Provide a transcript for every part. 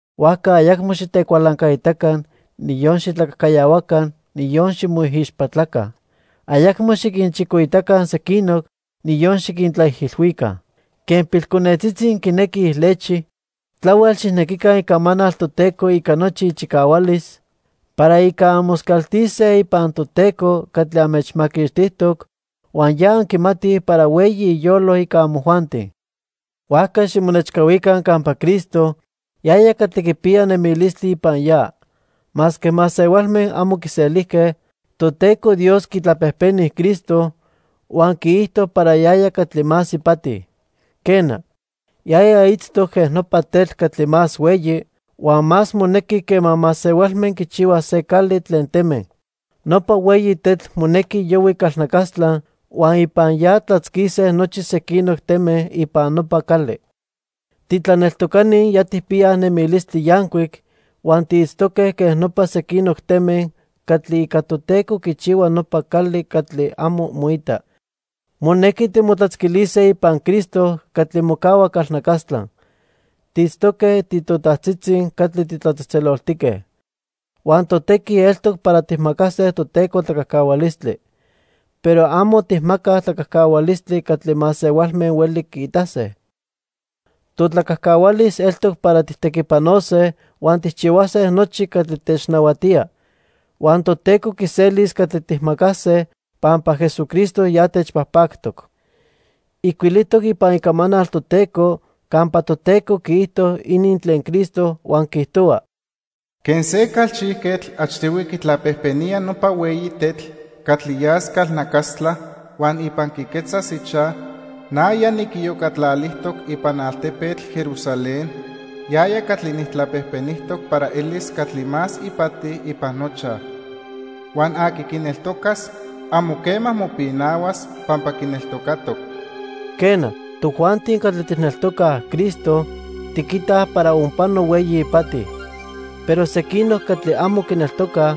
Huajca ayacmo xitecualancaitaca, niyon xitlacajcayahuaca, niyon ximoijixpatlaca. Ayacmo xiquinchicoitaca sequinoc, niyon xiquintlaijilhuica. Quen pilconetzitzi quinequij lechi, tlahuel xijnequica Icamanal Toteco ica nochi ichicahualis para ica anmoscaltise ipan Toteco catli anmechmaquixtijtoc, huan ya anquimatij para hueyi iyolo ica amojuanti. Huajca ximonechcahuica campa Cristo, yaya catli quipiya nemilistli ipan ya. Masque masehualme amo quiselijque, Toteco Dios quitlapejpeni Cristo huan quiijto para yaya catli más ipati. Quena, yaya itztoc quen nopa tetl catli más hueyi huan más monequi quema masehualme quichihuaj se cali tlen teme. Nopa hueyi tetl monequi yohui calnacastla huan ipan ya tlatzquise nochi sequinoc teme ipan nopa cali. Titlaneltocani ya tijpiyaj nemilistli yancuic huan tiitztoque quen nopa sequinoc teme catli ica Toteco quichihua nopa cali catli amo moita. Monequi timotlatzquilise ipan Cristo catli mocahua calnacastla. Tiitztoque titotajtzitzi catli titlatzejtzeloltique. Huan totequi eltoc para tijmacase Toteco tlacajcahualistli. Pero amo tijmacaj tlacajcahualistli catli masehualme hueli quiitase. Totlacajcahualis eltoc para tijtequipanose, huan tijchihuase nochi catli technahuatía. Huan Toteco quiselis catli tijmacase pampa Jesucristo ya techpajpactoc. Ijcuilijtoc ipan Icamanal Toteco campa Toteco quiijto inin tlen Cristo, huan quiijtohua: "Quen se calchijquetl achtihui quitlapejpenía nopa hueyi tetl catli yas calnacastla huan ipan quiquetzas ichaj, na ya niquiyocatlalijtoc ipan altepetl Jerusalén yaya catli nijtlapejpenijtoc para elis catli más ipati ipan nochaj. Huan aqui quineltocas amo quema mopinahuas pampa quineltocatoc." Quena, tojuanti catli tijneltocaj Cristo, tiquitaj para onpano hueyi ipati. Pero sequinoc catli amo quineltocaj,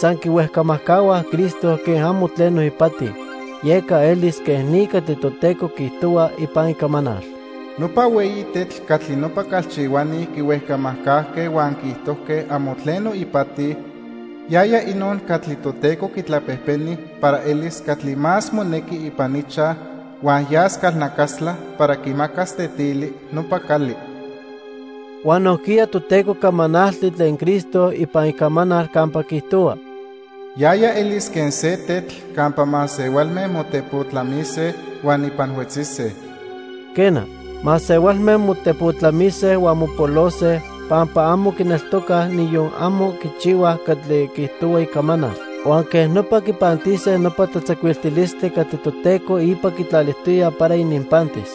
san quihuejcamajcahuaj Cristo quen amo tleno ipati. Yeca elis quej ni catli Toteco quiijtohua ipan Icamanal: "Nopa hueyi tetl catli nopa calchihuani quihuejcamajcajque huan quiijtojque amo tleno ipati, yaya inon catli Toteco quitlapejpeni para elis catli más monequi ipan ichaj huan yas calnacastla para quimacas tetili nopa cali." Huan nojquiya Toteco camanalti tlen Cristo ipan Icamanal campa quiijtohua: "Yaya elis quen se tetl campa masehualme motepotlamise huan ipan huetzise." Quena, masehualme motepotlamise huan mopolose pampa amo quineltocaj niyon amo quichihuaj catli quiijtohua Icamanal, huan quej nopa quipantise nopa tlatzacuiltilistli catli Toteco ipa quitlalijtoya para ininpantis.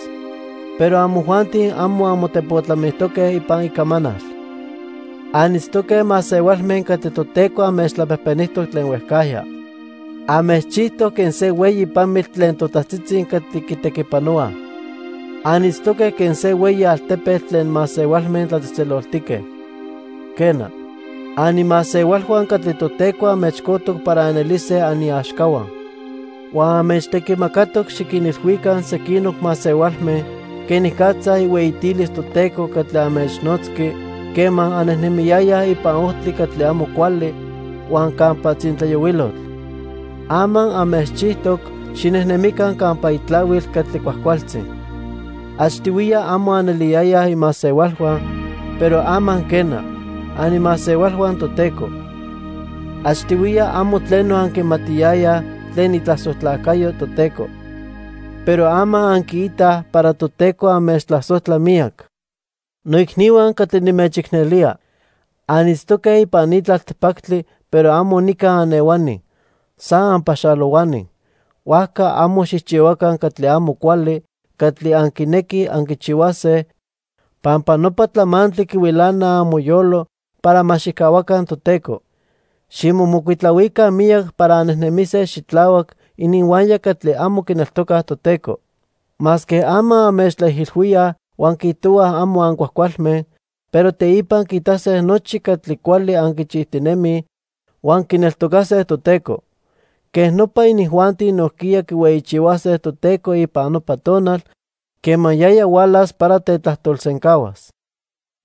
Pero amojuanti amo anmotepotlamijtoque ipan Icamanal. Anitztoque masehualme catli Toteco anmechtlapejpenijtoc tlen huejcajya. Anmechchijtoc quen se hueyi pamitl tlen totajtzitzi catli quitequipanohuaj. Anitztoque quen se hueyi altepetl tlen masehualme tlatzejtzeloltique. Quena, animasehualhua catli Toteco anmechcojtoc para anelise aniaxcahua. Huan anmechtequimacatoc xiquinilhuica sequinoc masehualme quenicatza ihueyitilis Toteco catli anmechnotzqui quema annejnemiyayaj ipan ojtli catli amo cuali huan campa tzintlayohuilotl. Ama anmechchijtoc xinejnemica campa itlahuil catli cuajcualtzi. Achtihuiya amo aneliyayaj imasehualhua, pero ama quena, animasehualhua Toteco. Achtihuiya amo tleno anquimatiyayaj tlen itlasojtlacayo Toteco, pero ama anquiitaj para Toteco anmechtlasojtla miyac. Noicnihua catli nimechicnelía. Anitztoque ipan ni tlaltipactli pero amo nica anehuani, san anpaxalohuani. Huajca amo xijchihuaca catli amo cuali catli anquinequij anquichihuase, pampa nopa tlamantli quihuilana amoyolo para ma xijcahuaca Toteco. Ximomocuitlahuica miyac para annejnemise xitlahuac ininhuaya catli amo quineltocaj Toteco. Masque ama anmechtlaijilhuíaj huan quiijtohuaj amo ancuajcualme, pero teipa quiitase nochi catli cuali anquichijtinemij huan quineltocase Toteco. Quej nopa inijuanti nojquiya quihueyichihuase Toteco ipan nopa tonal quema yaya hualas para tetlajtolsencahuas.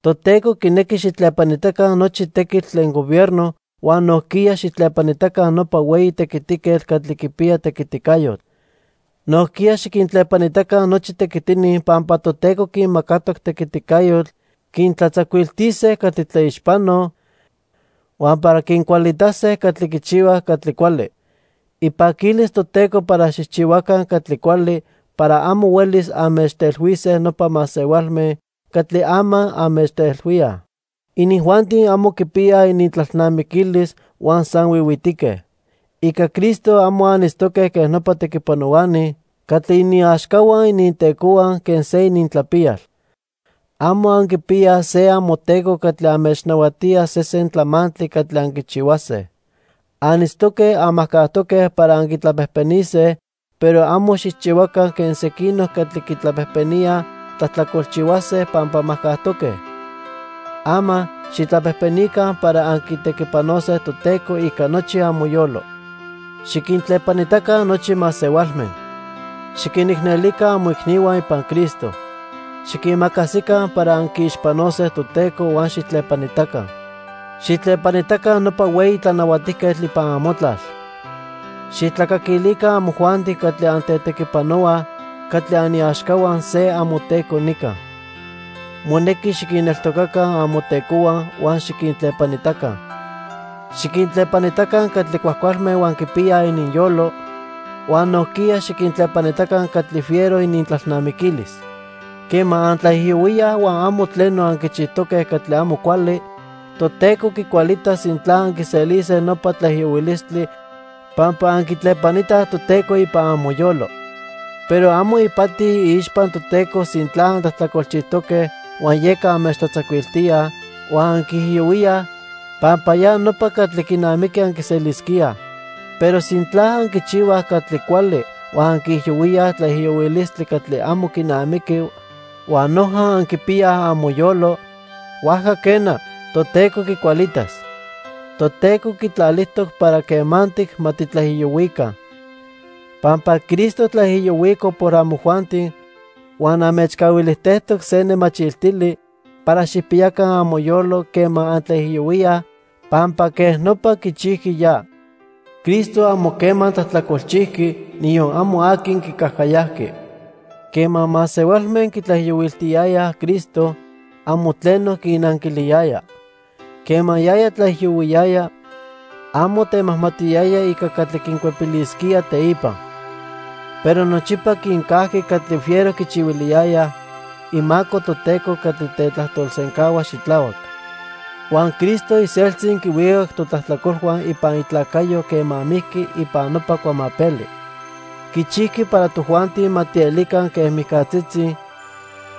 Toteco quinequi xijtlepanitaca nochi tequitl tlen gobierno huan nojquiya xijtlepanitaca nopa hueyi tequitiquetl catli quipiya tequiticayotl. Nojquiya xiquintlepanitaca nochi tequitini pampa Toteco quinmacatoc tequiticayotl quintlatzacuiltise catli tlaixpanoj huan para quincualitase catli quichihuaj catli cuali. Ipaquilis Toteco para xijchihuaca catli cuali para amo huelis anmechtelhuise nopa masehualme catli ama anmechtelhuíaj. Inijuanti amo quipiyaj inintlalnamiquilis huan san huihuitique. Ica Cristo amo anitztoque quen nopa tequipanohuani catli iniaxcahua inintecohua quen se inintlapiyal. Amo anquipiyaj se amoteco catli anmechnahuatía sesen tlamantli catli anquichihuase. Anitztoque anmajcajtoque para anquitlapejpenise, pero amo xijchihuaca quen sequinoc catli quitlapejpeníaj tlajtlacolchihuase pampa majcajtoque. Ama xijtlapejpenica para anquitequipanose Toteco ica nochi amoyolo. Xiquintlepanitaca nochi masehualme. Xiquinicnelica amoicnihua ipan Cristo. Xiquimacasica para anquiixpanose Toteco huan xijtlepanitaca. Xijtlepanitaca nopa hueyi tlanahuatijquetl ipan amotlal. Xijtlacaquilica amojuanti catli antetequipanohuaj catli aniaxcahua se amoteco nica. Monequi xiquinneltocaca amotecohua huan xiquintlepanitaca. Xiquintlepanitaca catli cuajcualme huan quipiyaj ininyolo, huan nojquiya xiquintlepanitaca catli fiero inintlalnamiquilis. Quema antlaijiyohuíaj huan amo tleno anquichijtoque catli amo cuali, Toteco quicualitas sintla anquiselise nopa tlaijiyohuilistli pampa anquitlepanitaj Toteco ipan amoyolo. Pero amo ipati iixpa Toteco sintla antlajtlacolchijtoque huan yeca anmechtlatzacuiltíaj huan anquiijiyohuíaj, pampa ya nopa catli quinamiqui anquiselisquíaj. Pero sintla anquichihuaj catli cuali huan anquiijiyohuíaj tlaijiyohuilistli catli amo quinamiqui huan noja anquipiyaj amoyolo, huajca quena, Toteco quicualitas. Toteco quitlalijtoc para quemantic ma titlaijiyohuica. Pampa Cristo tlaijiyohuico por amojuanti huan anmechcahuilijtejtoc se nemachiltili para xijpiyaca amoyolo quema antlaijiyohuíaj pampa quej nopa quichijqui ya. Cristo amo quema tlajtlacolchijqui, niyon amo aqui quicajcayajqui. Quema masehualme quitlaijiyohuiltiyayaj Cristo, amo tleno quinnanquiliyaya. Quema yaya tlaijiyohuiyaya, amo temajmatiyaya ica catli quincuepilisquía teipa. Pero nochipa quincajqui catli fiero quichihuiliyayaj, imaco Toteco catli tetlajtolsencahua xitlahuac. Huan Cristo iseltzi quihuicac totlajtlacolhua ipan itlacayo quema mijqui ipan nopa cuamapeli. Quichijqui para tojuanti ma tielica quen mijcatzitzi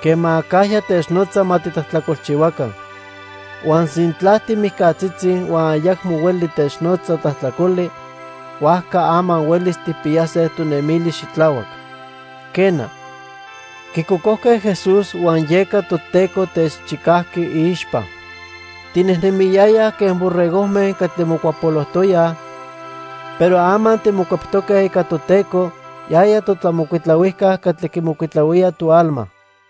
quema acajya technotza ma titlajtlacolchihuaca. Huan sintla timijcatzitzi huan ayacmo hueli technotza tlajtlacoli, huajca ama huelis tijpiyase tonemilis xitlahuac. Quena, quicocojque Jesús huan yeca Toteco techchicajqui iixpa. Tinejnemiyayaj quen borregojme catli mocuapolojtoyaj, pero ama timocueptoque ica Toteco, yaya totlamocuitlahuijca catli quimocuitlahuía toalma.